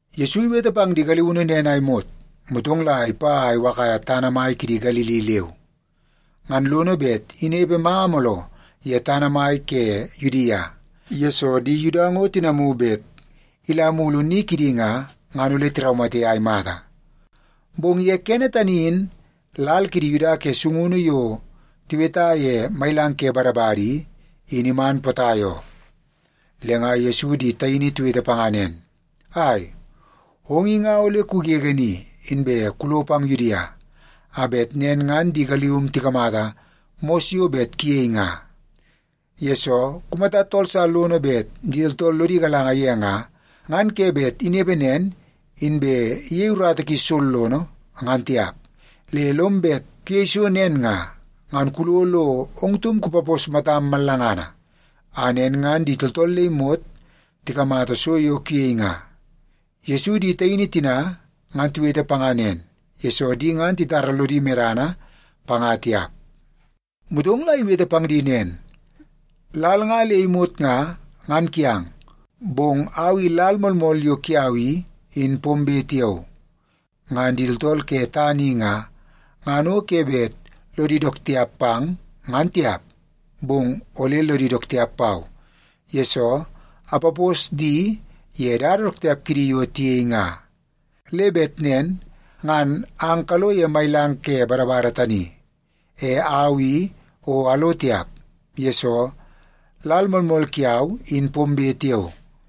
Yesu iwete pang di galiunu nen a imot, motong la ipa a iwakaia tana mai kidi Galili leu. Ngan lono bet inepe manga mooloo ye tana mai ke Yudia, yesoo di Yuda ngo tinamu bet ila mulu ni kidi nga, ngan ole tiraumate a imata. Bong ye kene tani in lal kidi Yuda ke sungunu yo tiweta ye Mailang ke Badabada i, in iman potai oo. Le nga Yesu di taini tiwete panga nen, “Ai, ong i nga ole kugege ni, inbe kulo pang Yudia, a bet nen ngan di galium tikamata mos yo bet kuyei nga. Yesoo, kumata tool sa lono bet di tooltool lodi galanga ye nga, ngan ke bet inepe nen inbe iyei urata ki sollono, ngan tiap. Le lom bet kuyei so nen nga, ngan kulo lo ong taum kupapos matam mallangana, a nen ngan di tooltool le imot tikamata so yo kuyei nga.” Yesu di taini tina ngan tiwete panga nen, yesoo di ngan titara lodi medana panga tiap. Motong la iwete pang di nen, “Lal nga le imot nga, ngan kiang, bong au i lal moolmool yo kiau i, in pombe tiao. Ngan di tooltool ke tana i nga, ngan o ke bet lodi dook tiap pang, ngan tiap, bong ole lodi dook tiap pau, yesoo apapos di ye dada dook tiap kidi yo tiyei nga. Le bet nen ngan ang kalo ye Mailang ke Badabada tani. E au i o alo tiap, yesoo lal moolmool kiau in pombe tiao.”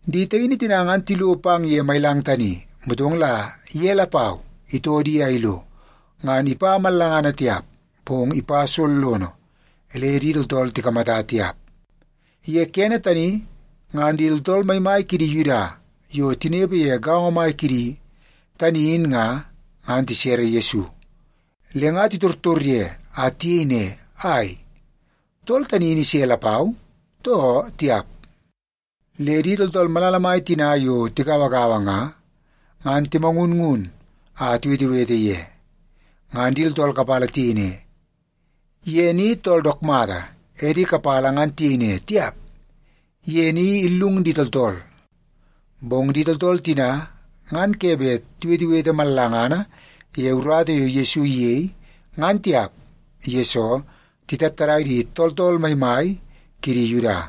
Di taini tina ngan tilo pang ye mailang tani, motong la ye lapau itoo di a ilo. Ngan ipa mallangana tiap, bong ipa sollono le di tooltool tikamata tiap. Ye kene tani ngan di tooltool maimai kidi Yuda yo tinepe ye gaongo mai kidi tani in nga, ngan tisere Yesu. Le nga titortor ye a tiyei ne, “Ai, tool tani in ise lapau, too tiap?” Le di tooltool malala mai tina yo tigauagaua nga, ngan timangunngun a tiwetewete ye. Ngan di tooltool kapala tiyei ne, “Ye ni tool dook mata.” E di kapala ngan tiyei ne, “Tiap, ye ni illung di tooltool.” Bong di tooltool tina ngan ke bet tiwetewete mallangana ye urata yo Yesu iyei, ngan tiap, yesoo titattadai di tooltool maimai kidi Yuda.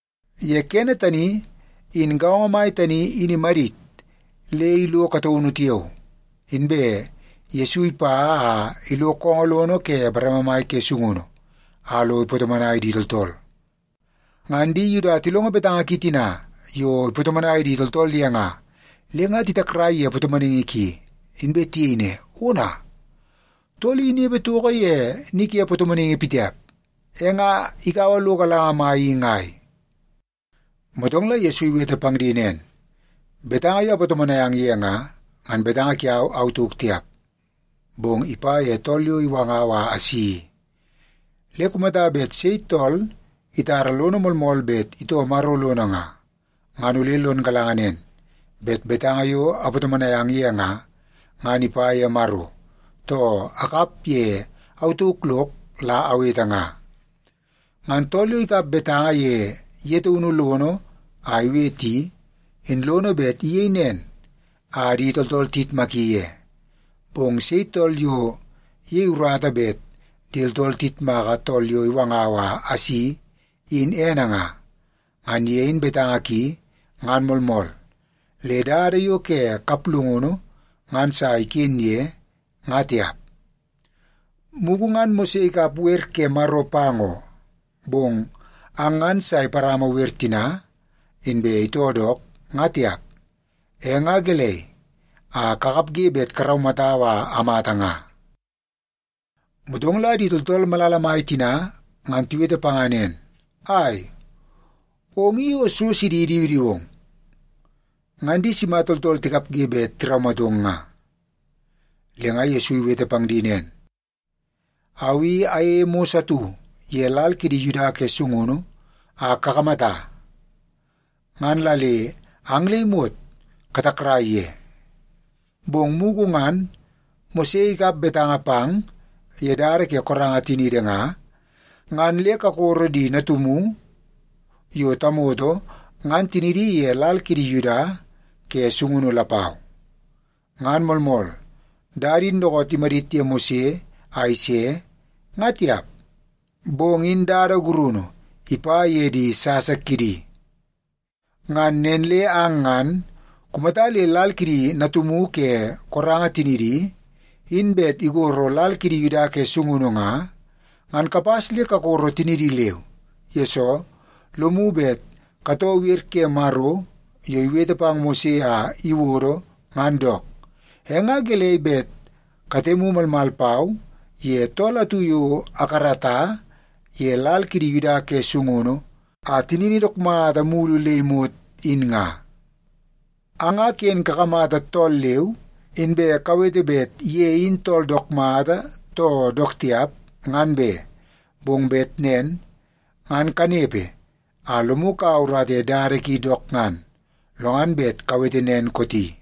Ye kene tani, in gaongo mai tani in imadit le ilo kataunu tiao, inbe Yesu ipa a ilo koongoo lono ke bareme mai ke sungunu a lo ipatomonai di tooltool. Ngan di Yuda tilongo betanga ki tina yo ipatomonai di tooltool ye nga, le nga titakrai ye patomonaingi ki. Inbe tiyei ne, “Ona, tool i inepe toko ye ni ke patomonaingi pitiap. E nga ikaua lo galanga mai i ngai?” Motong la Yesu iwete pang di nen, “Betanga yo apatomonai ang ye nga, ngan betanga kiau au tauk tiap, bong ipa ye tool yo iwangau a asi i. Le kumata bet sei tool itara lono moolmool bet itoo Maro lono nga, ngan ole lon galanga nen, bet betanga yo apatomonai ang ye nga, ngan ipa ye Maro, too akap ye au tauk lok la awete nga. Ngan tool yo ikap betanga ye ye taunu lono a iwete i, in lono bet iyei nen a di tooltool tiyitmaki ye. Bong sei tool yo iyei urata bet di tooltool tiyitmaka tool yo iwanga a isi in ene nga, ngan ye in betanga ki ngan moolmool, le dada yo ke kaplungunu ngan sa iken ye, nga tiap. Mugu ngan Mose ikap wer ke Maro pang oo, bong ang ngan sa iparama wer tina, inbe itoo dook, nga tiap. E nga gelei a kakapge bet karaumatau a amata nga?” Motong la di tooltool malala mai tina ngan tiwete panga nen, “Ai, ong i o so sidi idiwidiwong! Ngan di sima tooltool tikapge bet tiraumatong nga?” Le nga Yesu iwete pang di nen, “Au i ayeie mos atu ye lal kidi Yuda ke sungunu a kakamata, ngan la le ang le imot katakrai ye. Bong mugu ngan Mose ikap betanga pang ye dada ke koranga tiniidi nga, ngan le kakoro di natumu yo tamoto ngan tinidi ye lal kiidi Yuda ke sungunu lapau. (Ngan moolmool dada in dookoot imadit ye Mose a ise, nga tiap, bong in dada gurunu ipa ye di sasa kidi.) Ngan nen le ang ngan kumata le lal kidi natumu ke koranga tinidi in bet igoro lal kidi Yuda ke sungunu nga, ngan kapas le kakoro tinidi leu. Yesoo, lomu bet katoo wer ke Maro yo iwete pang Mose a iwodo ngan dook. E nga gelei bet katemu malmal pau ye tool atu yo akarata ye lal kidi Yuda ke sungunu a tinini dook mata mulu le imot, in nga? Ang nga ken kakamata tool leu, inbe kawete bet ye in tool dook mata, too dook tiap, ngan be! Bong bet nen ngan kanepe a lomu kaua urata ye dada ki dook ngan, lo ngan bet kawete nen kooti.”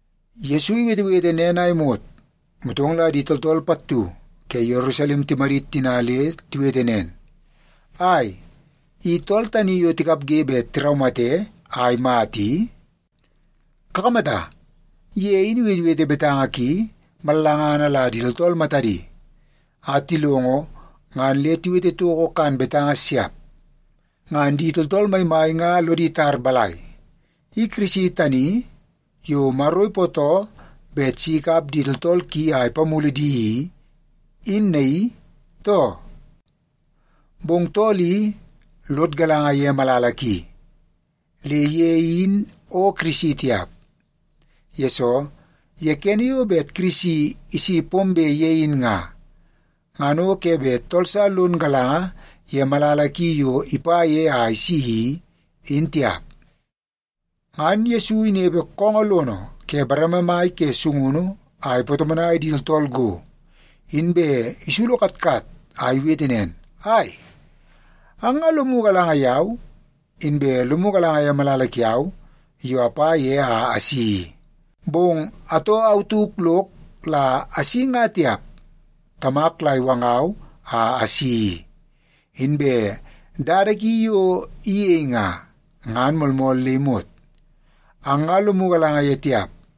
Yesu iwetewete nen a imot, motong la di tooltool pattu ke Yerusalem timadit tina le tiwete nen, “Ai, i tool tani yo tikapge bet tiraumate a imata i? Kakamata, ye in iwetewete betanga ki mallangana la di tooltool matadi a tilongo ngan le tiwete toko kan betanga siap. Ngan di tooltool maimai nga lodi tar balai, i Kirisi tani yo Maro ipootoo bet si ikap di tooltool ki a ipamulu di i, in naii, too? Bong tool i, lod galanga ye malala ki, le ye in o Kirisi tiap. Yesoo, ye kene yo bet Kirisi isi pombe ye in nga, ngan o ke bet tool sa lon galanga ye malala ki yo ipa ye a isi i, in tiap.” Ngan Yesu inepepe koongoo lono ke bareme mai ke sungunu a ipatomonai di tooltool go, inbe isulu katkat a iwete nen, “Ai, ang nga lomu galanga yau, inbe lomu galanga ye malala kiau yo apa ye a asi i. Bong atoo au tauk lok la asi nga tiap, Tamak la iwangau a asi i. Inbe dada ki yo iyei nga, ngan moolmool le imot. Ang nga lomu galanga ye tiap,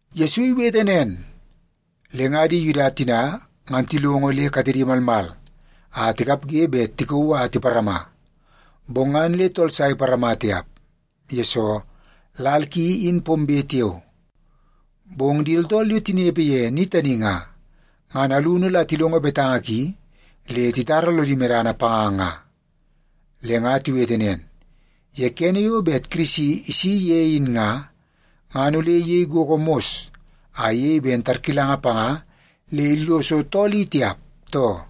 Yesu iwete nen, le nga di Yuda tina ngan tilongo le katedi malmal a tikapge bet tikauu a tiparama. Bong ngan le tool sa iparama tiap, yesoo lal ki in pombe tiao. Bong di tooltool yo tinepe ye ni tani nga, ngan alunu la tilongo betanga ki le titara lodi medana panga nga. Le nga tiwete nen, “Ye kene yo bet Kirisi isi ye in nga, ngan ole iyei gogo mos a iyei ben tarkilanga panga le illoso tool i tiap, too?”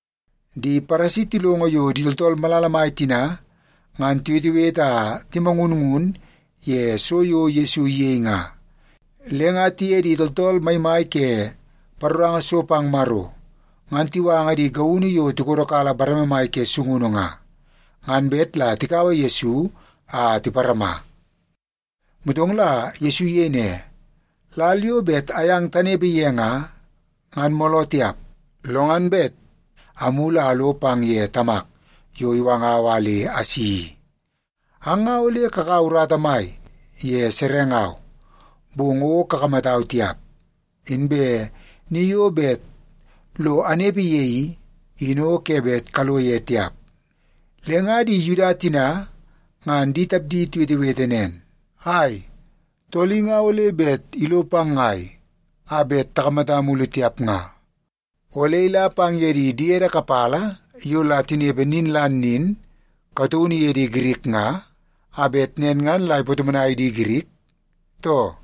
Di Paresi tilongo yo di tooltool malala mai tina ngan tiwetewete a timangunngun ye so yo Yesu iyei nga, le nga tiye di tooltool maimai ke paroranga so pang Maro ngan tiwanga di gaunu yo tikodokala bareme mai ke sungunu nga, ngan bet la tikaua Yesu a tiparama. Motong la Yesu iyei ne, “Lal yo bet ayang tanepe ye nga, ngan mooloo tiap, lo ngan bet amulu a alo pang ye Tamak yo iwangau a le asi i. Ang nga ole kakaua urata mai ye serengau, bong o kakamatau tiap. Inbe ni yo bet lo anepe ye i, in o ke bet kalo ye tiap.” Le nga di Yuda tina ngan di tapdi tiwetewete nen, “Ai, tool i nga ole bet ilo pang ngai a bet takamata mulu tiap nga? Ole ila pang ye di diede kapala yo la tinepe nin la nin kataunu ye di Girik nga, a bet nen ngan la ipatomonai di Girik, too?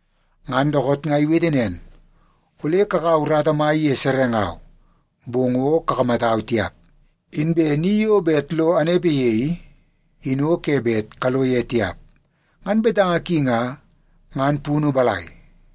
Ngan dookoot nga iwete nen, ‘Ole kakaua urata mai ye serengau, bong o kakamatau tiap. Inbe ni yo bet lo anepe ye i, in o ke bet kalo ye tiap.’ Ngan betanga ki nga, ngan punu balai?”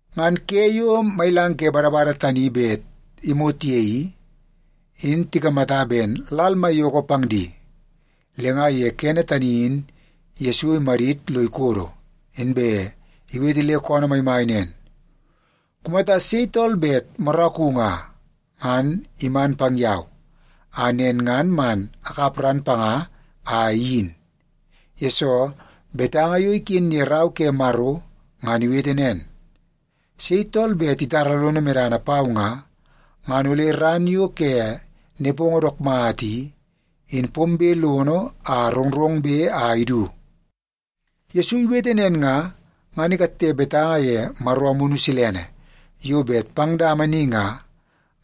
Ngan ke yo Mailang ke Badabada tani bet imot ye i, in tikamata ben lal maiyoko pang di. Le nga ye kene tani in Yesu imadit lo ikodo, inbe iwete le koonoo maimai nen, “Kumata sei tool bet moraku nga, ngan iman pang yau, a nen ngan man akap ran panga a iyin. Yesoo, betanga yo iken ye Rau ke Maro ngan iwete nen, sei tool bet itara lono medana pau nga, ngan ole ran yo ke nepongo dook mata i, in pombe lono a rongrongbe a idu.” Yesu iwete nen nga, ngan ikatte betanga ye Maro Amunu Silene yo bet pang dama ni nga,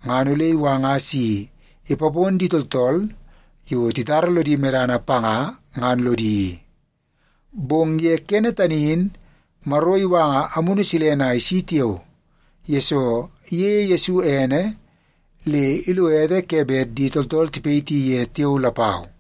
ngan ole iwanga si ipapon di tooltool yo titara lodi medana panga ngan lodi i. Bong ye kene tani in Maro iwanga Amunu Silene a isi tiao, yesoo iyeie Yesu ene le ilo ete ke bet di tooltool tipayiti ye tiao lapau.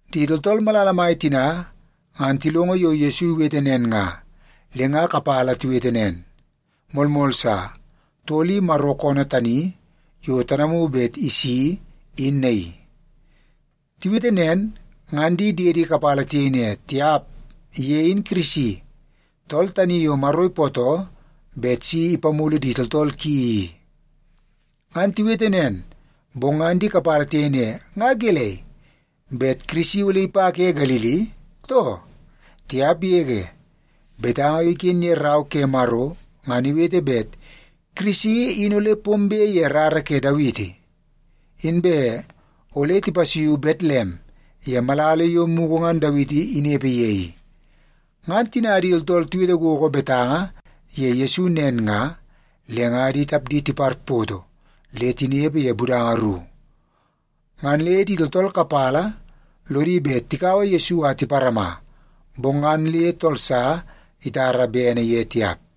Di tooltool malala mai tina ngan tilongo yo Yesu iwete nen nga, le nga kapala tiwete nen, “Moolmool sa! Tool i Maro koonoo tani yo tanamu bet isi, in naii.” Tiwete nen, ngan di diedi kapala tiyei ne, “Tiap! Ye in Kirisi, tool tani yo Maro ipootoo bet si ipamulu di tooltool ki i.” Ngan tiwete nen, bong ngan di kapala tiyei ne, “Nga gelei, bet Kirisi ole ipa ke Galili, too? Tiap yege! Betanga yo iken ye Rau ke Maro ngan iwete bet Kirisi in ole pombe ye rara ke Dawiti. Inbe ole tipasuiu Betlem ye malala yo mugu ngan Dawiti inepe ye i.” Ngan tina di tooltool tiwete gogo betanga ye Yesu nen nga, le nga di tapdi tiparpoto le tinepe ye budanga ru. Ngan le di tooltool kapala lodi bet tikaua Yesu a tiparama, bong ngan le tool sa itara bene ye tiap.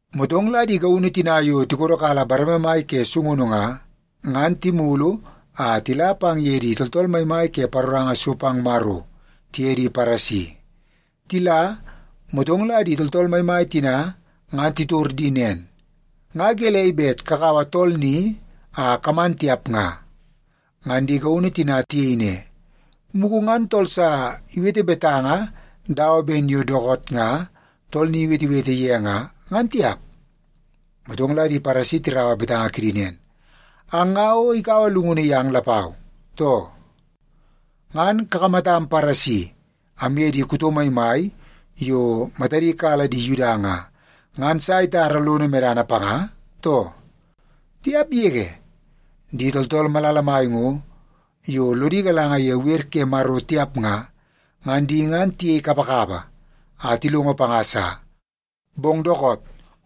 Motong la di gaunu tina yo tikodokala bareme mai ke sungunu nga, ngan timulu a tila pang ye di tooltool maimai ke paroranga so pang Maro tiye di Paresi. Tila, motong la di tooltool maimai tina ngan titor di nen, “Nga gelei bet kakaua tool ni a kaman tiap nga?” Ngan di gaunu tina tiyei ne, “Mugu ngan tool sa iwete betanga dawa ben yo dookoot nga tool ni iwetewete ye nga, ngan tiap.” Motong la di Paresi tirau betanga kidi nen, “Ang nga o ikaua llungunu yang lapau, too? Ngan kakamatam Paresi amye di kuto maimai yo matadi kala di Yuda nga, ngan sa itara lono medana panga, too? Tiap yege! Di tooltool malala mai ngo, yo lodi galanga ye wer ke Maro tiap nga, ngan di ngan tiyei kapakapa a tilongo panga sa. Bong dookoot,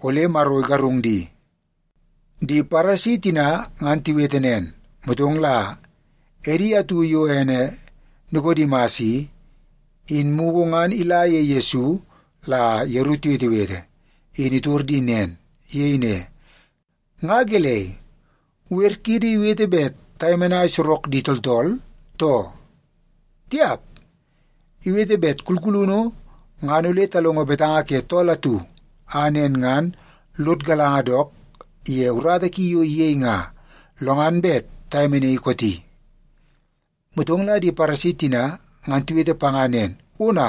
ole Maro igarung di.” Di Paresi tina ngan tiwete nen, motong la edi atu yo ene Nikodimas i, in mugu ngan ila ye Yesu la yeru tiwetewete, in itor di nen. Iyei ne, “Nga gelei, wer kiidi iwete bet tayemenai sorok di tooltool, too? Tiap, iwete bet kulkulunu ngan ole talongo betanga ke tool atu, a nen ngan lod galanga dook ye urata ki yo iyei nga, lo ngan bet tayemenaii kooti.” Motong la di Paresi tina ngan tiwete panga nen, “Ona,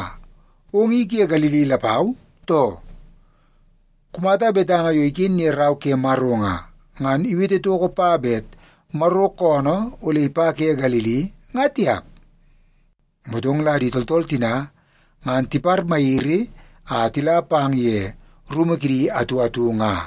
ong i ke Galili lapau, too? Kumata betanga yo iken ye Rau ke Maro nga, ngan iwete toko pa bet Maro koonoo ole ipa ke Galili, nga tiap.” Motong la di tooltool tina ngan tiparmayiri a tila pang ye rumu kidi atu atu nga.